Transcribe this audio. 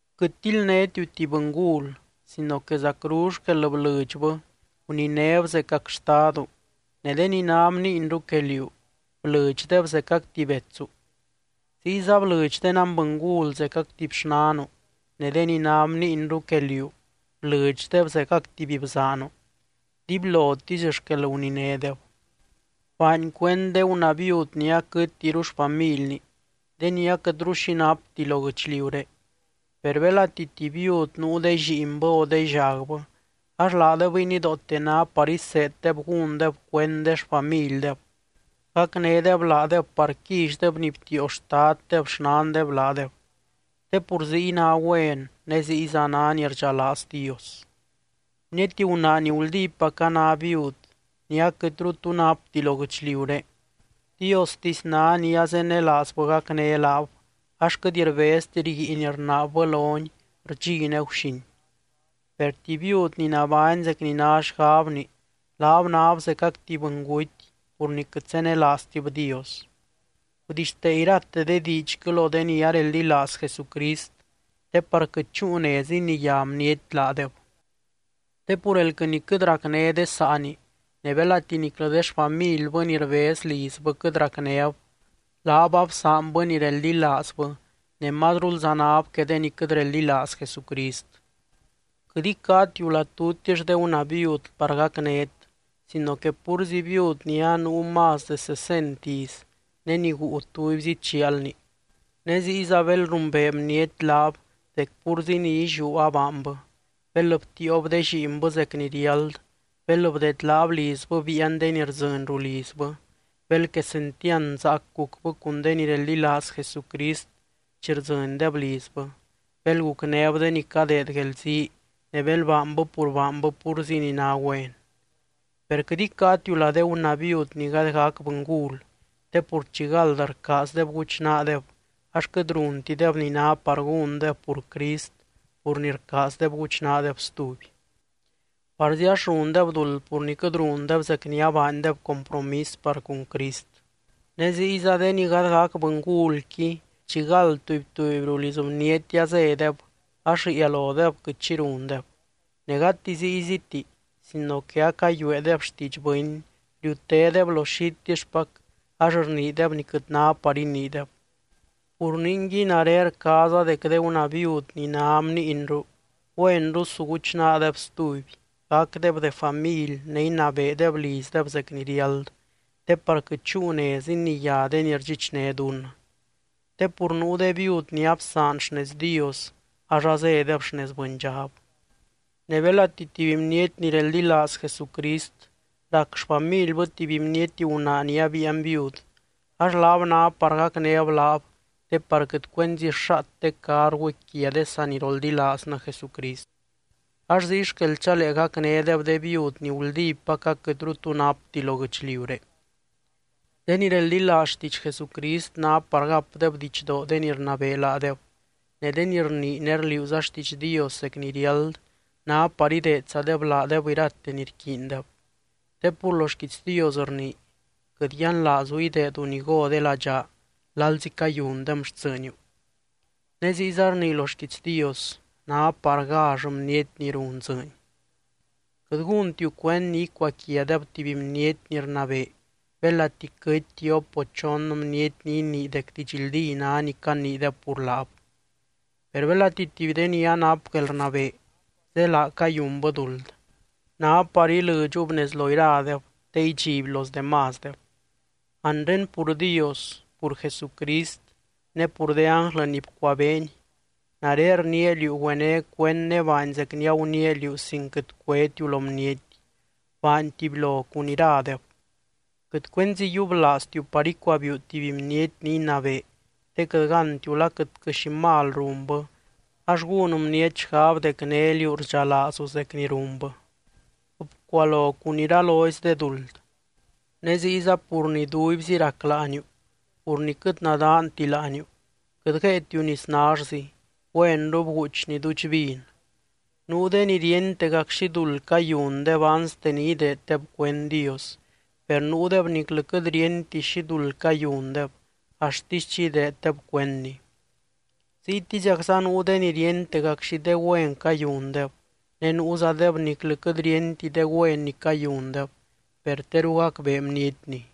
Quɨt tildnétiu tuby bɨngul sino que zacru xquel blɨdxbɨ guninéb zecac xtadu, ne de ni ná bniinru que liú, blɨdxdeb zecac tuby betsu. Ziyza blɨdx de nanbɨngul zecac tuby xnanu, ne de ni ná bniinru que liú, blɨdxdeb zecac tuby bzaanu, dibylotisy xquel guninédeb. Baany cuend de gunaa viud ni aquɨtiru xfamilni, de ni aquɨtru xi napti lo guɨchliuré. Per belati tuby viud nuu de lliinbɨ o de llagbɨ, ax laadebɨy nidoote ná par iseeddeb gúndeb cuend de xfamildeb, gacnédeb laadeb par quillydeb ni btiio xtaddeb xnandeb laadeb. Te pur ziy ná güen, ne ziyza ná ni rdxalaaz Dios. Bniety gunaa ni guldípac a ná viud, ni aquɨtru tu napti lo guɨchliuré, Diostisy ná ni azenelaazbɨ gacné laab ax quɨt rbezti rguiin rnaabbɨ lony rdxi ne guxin. Per tuby viud ni nabány zec ni ná xgabni, laab náb zecac tuby bɨnguty pur ni quɨt zenelaaztib Dios. Gudixtee irate de diidxquɨ lo de ni areldilaaz Jesucrist te par quɨt chúu nez iniyá bniety laadeb. Te pur elquɨ ni quɨt racné de saani, ne belati niclɨ de xfamilbɨ ni rbez lizbɨ quɨt racnéb, laab absaanbɨ ni reldilaazbɨ ne mazrulza náb que de ni quɨt reldilaaz Jesucrist. Quɨt icáatiu lá tutix de gunaa viud par gacnét sino que púrzi viud ni anuu más de sesent iz ne ni guu tubyzi chialni. Ne ziyza bel rumbee bniety laab dec púrzi ni illiú abaanbɨ, bel btiiob de lliinbɨ zec ni riáld, bel bdedlaab lizbɨ biian de ni rdzɨny rulizbɨ, bel quesentiand zaac gucbɨ cun de ni reldilaaz Jesucrist chi rdzɨndeb lizbɨ, bel gucnéb de ni cadeed guelzii, ne bel baanbɨ pur baanbɨ púrzi ni ná güen. Per quɨt icáatiu lá de gunaa viud ni gady gac bɨngul, te pur chi gald rcaazdeb guchnaadeb ax quɨt runtideb ni ná par gúndeb pur Crist pur ni rcaazdeb guchnaadeb stuby. Parzi ax rundeb duld pur ni quɨt rundeb zec ni abaandeb compromis par cun Crist. Ne ziyza de ni gady gac bɨngulqui chigald tuby, tuby ruliz bniety azédeb ax riia lodeb quɨt xi rundeb. Ne gati zíyziti, sino que acayueedeb xtiidx bɨny, riutédeb lo xitixpac ax rniideb ni quɨt ná par iniideb. Pur ningui, nare rcaaza dec de gunaa viud ni ná bniinru, güenru su guchnaadeb stuby, gacdeb de family ne inabeedeb lizdeb zec ni riáld, te par quɨt chúu nez iniyá de ni rdxichné dunnɨ. Te pur nuu de viud ni absaan xnez Dios ax azédeb xnez bɨndxab. Ne belati tuby bniety ni reldilaaz Jesucrist rac xfamilbɨ tuby bniety gunaa ni abiian viud, ax laab ná par gacnéb laab te par quɨt cuenzi xaat de carguqui quia de saniroldilaaznɨ Jesucrist. Ax ziy xquel chalee gacnédeb de viud ni guldípac aquɨtru tu napti lo guɨchliuré. De ni reldilaaz xtiidx Jesucrist ná par gapdeb didxdoo de ni rnabee laadeb ne de ni rnii ne rliuuza xtiidx Dios zec ni riáld, ná par ideedzadeb laadeb irate ni rquiindeb. Te pur lo xquiits Dios rnii: “Quɨt yianlaazu ideedu ni go de ladxaa lalzi cayundem xtsɨɨniu”, ne ziyza rnii lo xquiits Dios: “Ná par gall bniety ni run dzɨɨny.” Quɨt gúntiu cuend ni icuaquiadeb tuby bniety ni rnabee belati quɨty tiop o chon bniety ni inii dec didxldí ná ni caniideb pur laab. Per belati tuby de ni anap guelrnabee zélaa cayunbɨ duld, ná par ilɨdxub nez lo iradeb te idxiby los demásdeb. Anre pur Dios, pur Jesucrist ne pur de ánglɨ ni bcuabeeny, nare rniia liú güené cuend ne baany zec ni aguniia liú sin quɨt cuétiu lo bniety, baany tubylo cun iradeb. Quɨt cuenzi yiublaaztiu par icuabiiu tuby bniety ni inabee te quɨt gántiu la quɨtquɨ xi mal runbɨ, ax gún bniety xgab dec né liú rdxalaazu zec ni runbɨ. Bcualo cun iralozy de duld. Ne ziyza pur ni duibzi rac láaniu, pur ni quɨt nadaanti láaniu, quɨt guéetiu nis nallzi, güenru bguuchni duudx vin. Nuu de ni ríentegac xi duld cayundeb anste ni ideeddeb cuend Dios, per nuudeb niclɨ quɨt ríenti xi duld cayundeb axtisy chi ideeddeb cuendny. Ziytiziacza nuu de ni ríentegac xi de güen cayundeb, ne nuuzadeb niclɨ quɨt ríenti de güen ni cayundeb, per teru gacbee bnietni.